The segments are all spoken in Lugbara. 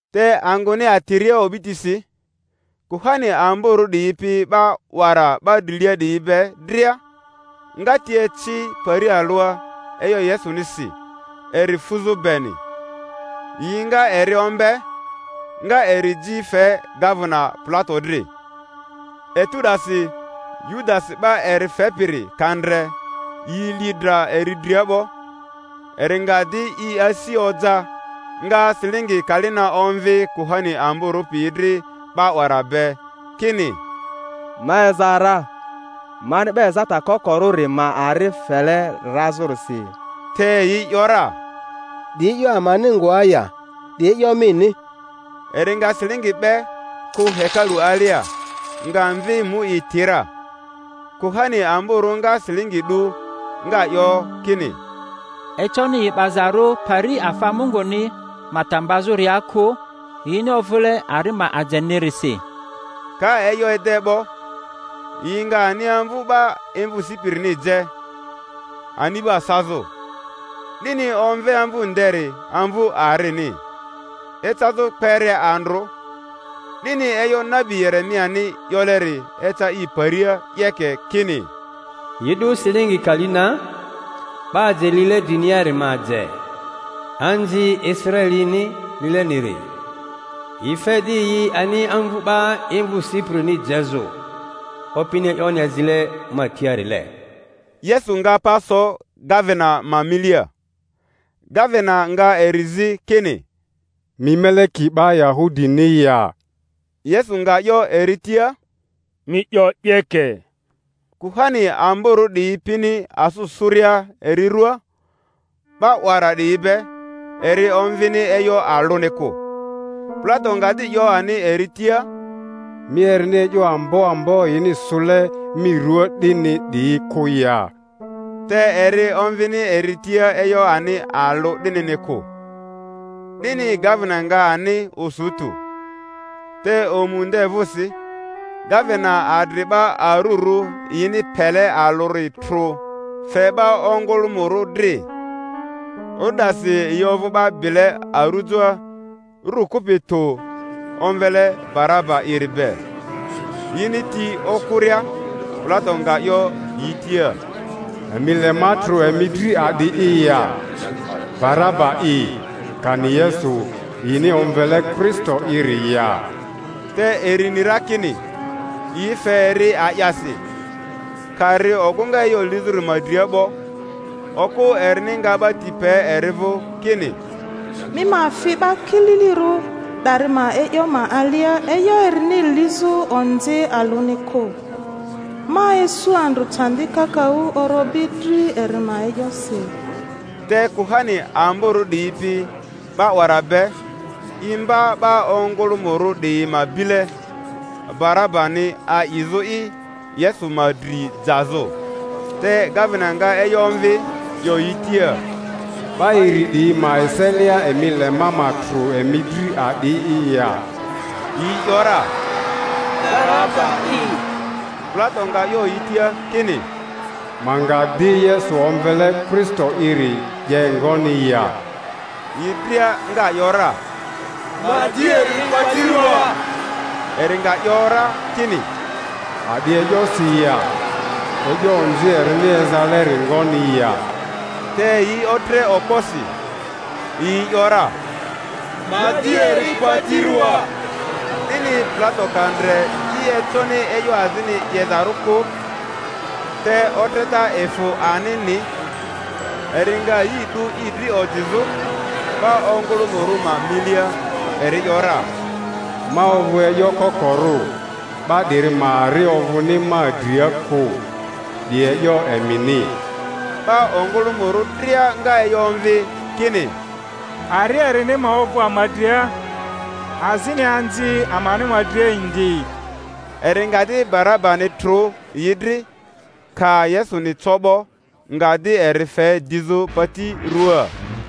Te angᴜni atiria o'bitisi, kuhani amborᴜ 'diyi pi 'ba 'wara 'ba drilia 'diyi be dria nga ti eci pari alᴜa e'yo Yesunisi eri fuzᴜ beni; yi nga eri ombe, nga eri ji fe gavena Pilato dri. Etu 'dasi Yudasi 'ba eri fepiri, ka ndre yi li dra eri dria 'bo, eri nga di i asi oja, nga silingi kali na omvi kuhani amborᴜ piyi dri 'ba 'wara be, kini, Ma eza ra, mani 'ba ezata kokorᴜri ma ari fele razᴜrisi. Te yi ‘yora, 'Di e'yo amani ngoa ya? 'Di e'yo mini. Eri nga silingi 'be, kᴜ hekalu alia, nga mvi mu i ti ra. Kuhani amborᴜ nga silingi 'du, nga 'yo kini, Econi yi 'bazarᴜ pari afa Munguni ma ta mbazᴜria kᴜ, yini ovᴜle ari ma ajenirisi. Ka e'yo ede 'bo, yi nga ani amvu 'ba imvᴜ sipirini je, ani'ba sazᴜ. 'Dini omve amvu nderi Amvu Arini, ecazᴜ kpere andrᴜ. 'Dini e'yo nabi Yeremiani 'yoleri eca i paria 'yeke, kini, Yi 'du silingi kali na, 'ba aje lile driniari ma aje, anzi Israelini lileniri, yi fe di yi ani amvu 'ba imvᴜ sipirini jezᴜ, Opini e'yoni azile ma tiarile. Yesu nga pa so gavena ma milia; gavena nga eri zi kini, Mi meleki 'ba Yahudini ya? Yesu nga 'yo eri tia, Mi 'yo 'yeke. Kuhani amborᴜ 'diyi pini asᴜ sᴜria eri rᴜaa 'ba 'wara 'diyi be, eri omvini e'yo alᴜni kᴜ. Pilato nga di 'yo ani eri tia, Mi erini e'yo ambo ambo yini sᴜle mi ruaa 'dini 'diyi kᴜ ya? Te eri omvini eri tia e'yo ani alᴜ 'dinini kᴜ; 'dini gavena nga ani osu tᴜ. Te omu nde vᴜsi, gavena adri 'ba arurᴜ yini pele alᴜri trᴜ fe 'ba ongᴜlᴜmᴜrᴜ dri. O'du 'dasi yi ovᴜ 'ba bile arujoa, ru kupi tᴜ, omvele Baraba'iri be. Yini ti okᴜria, Pilato nga 'yo yi tia, Emi le ma trᴜ emi dri a'di'i ya? Baraba'i kani Yesu yini omvele Kristo'iri ya? Te eri ni ra kini yi fe eri a'yasi. Ka ri ogᴜŋa e'yo lizᴜri ma dria. 'bo, okᴜ erini nga 'ba ti pe eri vᴜ, kini, Mi ma fi 'ba kililirᴜ 'dari ma e'yo ma alia e'yo erini lizᴜ onzi alᴜni kᴜ; ma isu andrᴜ candi kakaᴜ orobi dri eri ma e'yosi. Te kuhani amborᴜ 'diyi pi 'ba 'wara be imba 'ba ongᴜlᴜmᴜrᴜ 'diyi ma bile Barabani a'izᴜ'i, Yesu ma dri jazᴜ. Te gavena nga e'yo omvi, 'yo yi tia, 'Ba iri 'diyi ma eselia, emi le ma ma trᴜ emi dri a'di'i ya? Yi ‘yora, Baraba'i. Pilato nga 'yo yi tia kini, Ma nga di Yesu omvele Kristo'iri 'ye ngoni ya? Yi dria nga ‘yora, Ma di eri pati rᴜaa. Eri nga 'yo ra kini, A'di e'yosi ya? E'yo onzi erini ezaleri ngoni ya? Te yi otre okposi, yi ‘yora, Ma di eri pati ruaa. 'Dini Pilato ka ndre i econi e'yo azini 'yezarᴜ kᴜ, te otreta efᴜ anini, eri nga yi 'du i dri ojizᴜ 'ba ongᴜlᴜmᴜrᴜ ma milia, eri ‘yora, Ma ovᴜ e'yo kokorᴜ, 'ba 'diri ma ari ovᴜni ma dria kᴜ; 'di e'yo emini. 'Ba ongᴜlᴜmᴜrᴜ dria nga e'yo omvi kini, Ari erini ma ovᴜ ama dria, azini anzi amani ma dria indi. Eri nga di Barabani trᴜ yi dri; ka Yesuni co 'bo, nga di eri fe dizᴜ pati ruaa.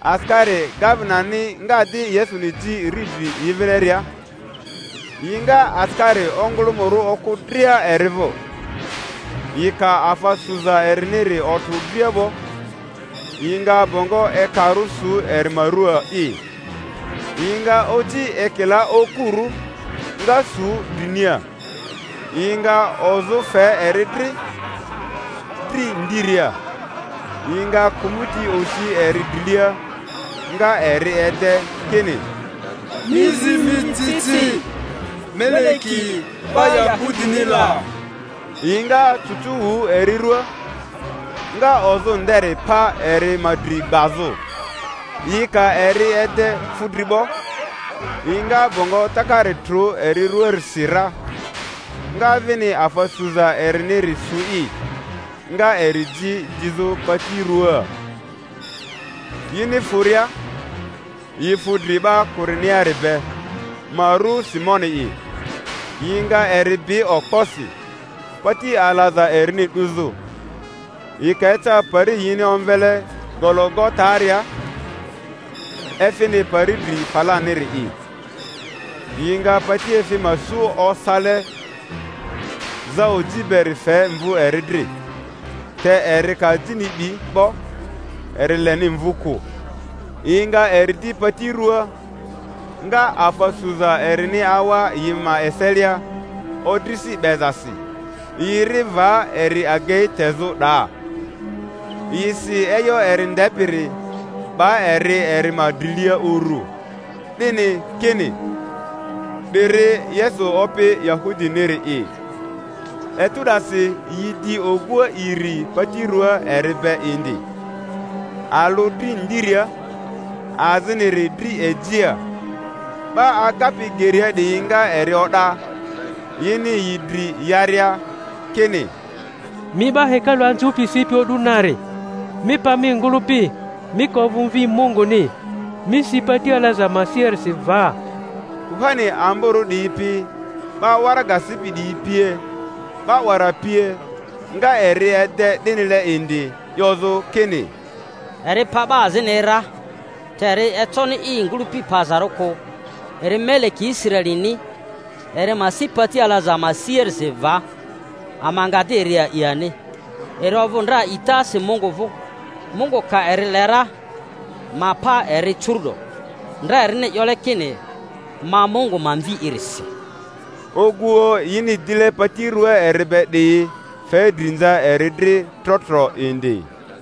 Asikari gavenani nga di Yesuni ji riidri yi vileria, yi nga asikari ongᴜlᴜmᴜrᴜ okᴜ dria eri vᴜ. Yi ka afa suza eriniri otrᴜ dria 'bo, yi nga bongo ekarᴜ su eri ma ruaa'i, yi nga oci ekila okurᴜ, nga sᴜ drinia, yi nga ozᴜ fe eri dri, dri ndiria. Yi nga kᴜmᴜti osi eri drilia, nga eri ede, kini, Mi zi mi ci ci, Meleki 'ba Yahudini la! Yi nga cucu wᴜ eri ruaa, nga ozᴜ nderi pa eri ma dri gbazᴜ. Yi ka eri ede fudri 'bo, yi nga bongo takari trᴜ eri rᴜaarisi ra, nga vini afa suza eriniri su'i, nga eri ji dizᴜ pati ruaa. Yini fᴜria, yi fu dri 'ba Kureniari be, ma ru Simoni'i; yi nga eri bi okposi, pati alaza erini 'duzᴜ. Yi ka eca pari yini omvele Gologataria (efini pari dri falaniri'i), yi nga patiefi ma su osale zaoji beri fe mvu eri dri; te eri ka ajini 'bi 'bo, eri leni mvu kᴜ. Yi nga eri di pati ruaa, nga afa suza erini awa yi ma eselia odrisi 'bezasi; yi ri va eri agei tezᴜ 'daa. Yi si e'yo eri ndepiri, 'ba eri eri ma drilia uru, 'dini kini, 'DIRI YESU OPI YAHUDINIRI'I. Etu 'dasi yi di oguoᴜ iri pati ruaa eri be indi, alᴜ dri ndiria, aziniri dri ejia. 'Ba agapi geria 'diyi nga eri o'da, yini yi dri yaria, kini, Mi 'ba hekalu anzᴜpi, sipi o'du nari, mi pa mi ngᴜlᴜpi Mi ka ovᴜ Mvi Munguni, mi si pati alaza ma siarisi va. Kuhani amborᴜ 'diyi pi 'ba waraga sipi 'diyi pie, 'ba 'wara pie. nga eri ede 'dinile indi, 'yozᴜ kini, Eri pa 'ba azini ra; te eri econi i ngᴜlᴜpi pazarᴜ kᴜ. Eri Meleki Israelini; eri ma si pati alaza ma siarisi va, ama nga di eri a'i ani. Eri ovᴜ ndra a'itasi Mungu vᴜ; Mungu ka eri le ra, ma pa eri curu'do; ndra erini 'yole kini, Ma Mungu ma Mvi'i-risi. Oguoᴜ yini dile pati rᴜaa eri be 'diyi fe drinza eri dri tro tro indi.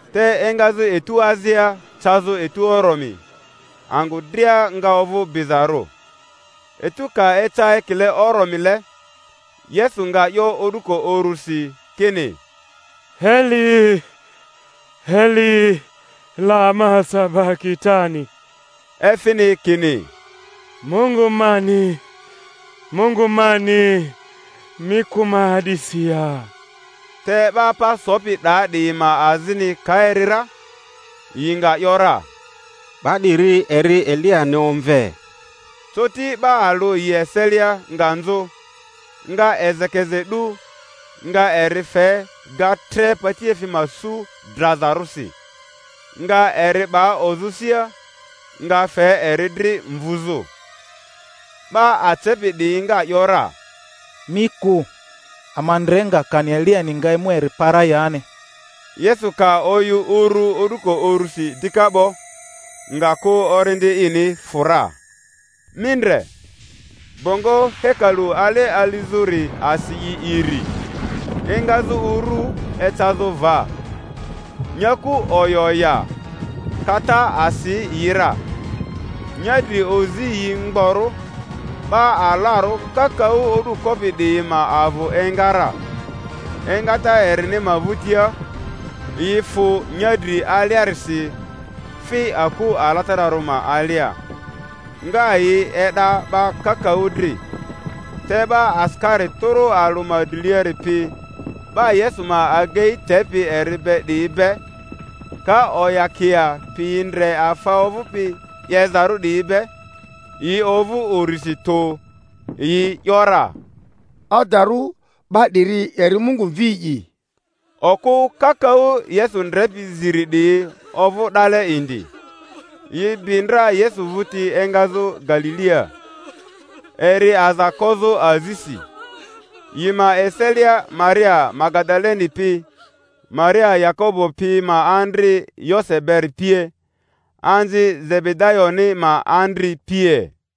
Te engazᴜ etu azia cazᴜ etu oromi angᴜ dria nga ovᴜ bizarᴜ. Etu ka eca ekile oromile Yesu nga 'yo o'duko urᴜsi kini, Eli, Eli, lama sabakitani? efini kini, Mungu mani, Mungu mani, mi kᴜ ma a'disi ya? Te 'ba pa sopi 'daa 'diyi ma azini ka eri ra, yi nga ‘yora, 'Ba 'diri eri Eliyani omve. Coti 'ba alᴜ yi eselia nga nzᴜ, nga ezekeze 'du, nga eri fe ga tre patiefi ma su drazarᴜsi, nga eri 'ba ozᴜ sia, nga fe eri dri mvuzᴜ. 'Ba acepi 'diyi nga ‘yora, Mi kᴜ, ama ndre nga kani Eliyani nga emu eri pa ra yani. Yesu ka oyᴜ uru o'duko urusi dika 'bo, nga kᴜ orindi ini fᴜ ra. Mi ndre, bongo hekalu ale alizᴜri asi i iri, engazᴜ uru ecazᴜ va; nyaku oya oya, kata asi yi ra; nyadri ozi yi mgborᴜ, 'ba alarᴜ kakaᴜ o'du kopi 'diyi ma avᴜ enga ra; engata erini ma vᴜtia yi fᴜ nyadri aliarisi, fi aku alatararᴜ ma alia, nga yi e'da 'ba kakaᴜ dri. Te 'ba asikari tᴜrᴜ alᴜ ma driliari pi 'ba Yesu ma agei tepi eri be 'diyi be, ka oyakia pi ndre afa ovᴜpi 'yezarᴜ 'diyi be, yi ovᴜ urisi tᴜ, yi ‘yora, Adarᴜ, 'ba 'diri eri Mungu Mvi'i! Okᴜ kakaᴜ Yesu ndrepi ziri 'diyi ovᴜ 'dale indi, yi bi ndra Yesu vᴜti engazᴜ Galilia, eri aza kozᴜ azisi; yi ma eselia Maria Magadaleni pi, Maria Yakobo pi ma andri Yose beri pie, anzi Zebedayoni ma andri pie.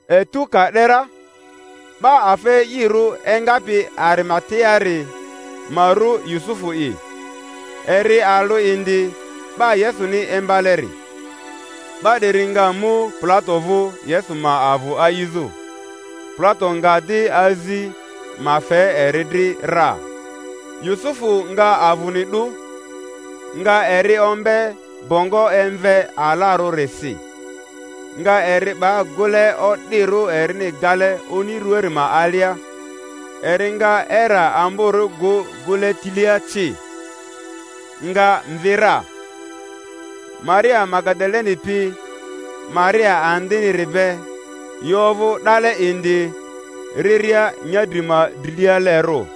Etu ka 'de ra, 'ba afa e'irᴜ engapi Arimateari, ma ru Yusufu'i, eri alᴜ indi 'ba Yesuni imbaleri, 'ba 'diri nga mu Pilato vᴜ Yesu ma avᴜ a'izᴜ. Pilato nga di azi ma fe eri dri ra. Yusufu nga avᴜni 'du, nga eri ombe bongo emve alarᴜrisi, nga eri 'ba gᴜle o'dirᴜ erini gale oni ruaari ma alia; eri nga era amborᴜ gᴜ gᴜle tilia ci. nga mvi ra. Maria Magadaleni pi Maria andiniri be, yi ovᴜ 'dale indi riria nyadri ma drilialerᴜ.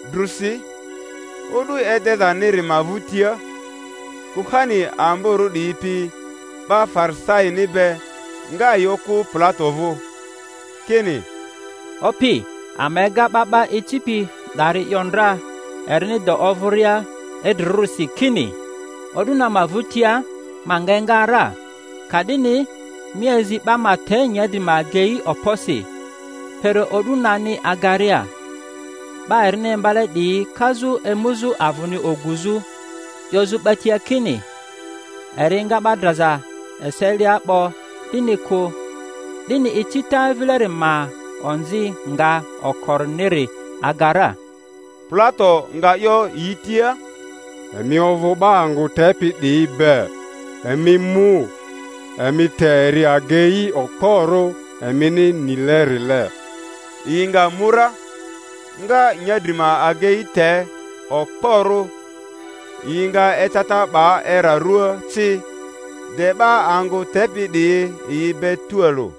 Drusi, o'du edezaniri ma vᴜtia, kuhani amborᴜ 'diyi pi 'ba Farisaini be nga yi okᴜ Pilato vᴜ, kini, Opi, ama ega 'ba 'ba icipi 'dari 'yo ndra erini de ovᴜria idrirᴜrisi, kini, O'du na ma vᴜtia ma nga enga ra. Ka'dini mi azi 'ba ma te nyadri ma agei okposi, kpere o'du nani agaria, 'ba erini imbale 'diyi kazᴜ emuzᴜ avᴜni oguzᴜ, 'yozᴜ 'ba tia kini, Eri enga 'ba draza eselia 'bo, 'dini kᴜ; 'dini icita vileri ma onzi nga okoriniri aga ra. Pilato nga 'yo yi tia, Emi ovᴜ 'ba angᴜ tepi 'diyi be; emi mu, emi te eri agei okporᴜ emini nilerile. Yi nga mu ra, nga nyadri ma agei te okporᴜ, yi nga eceta 'ba era ruaa ci, de 'ba angᴜ tepi 'diyi yi be tualᴜ.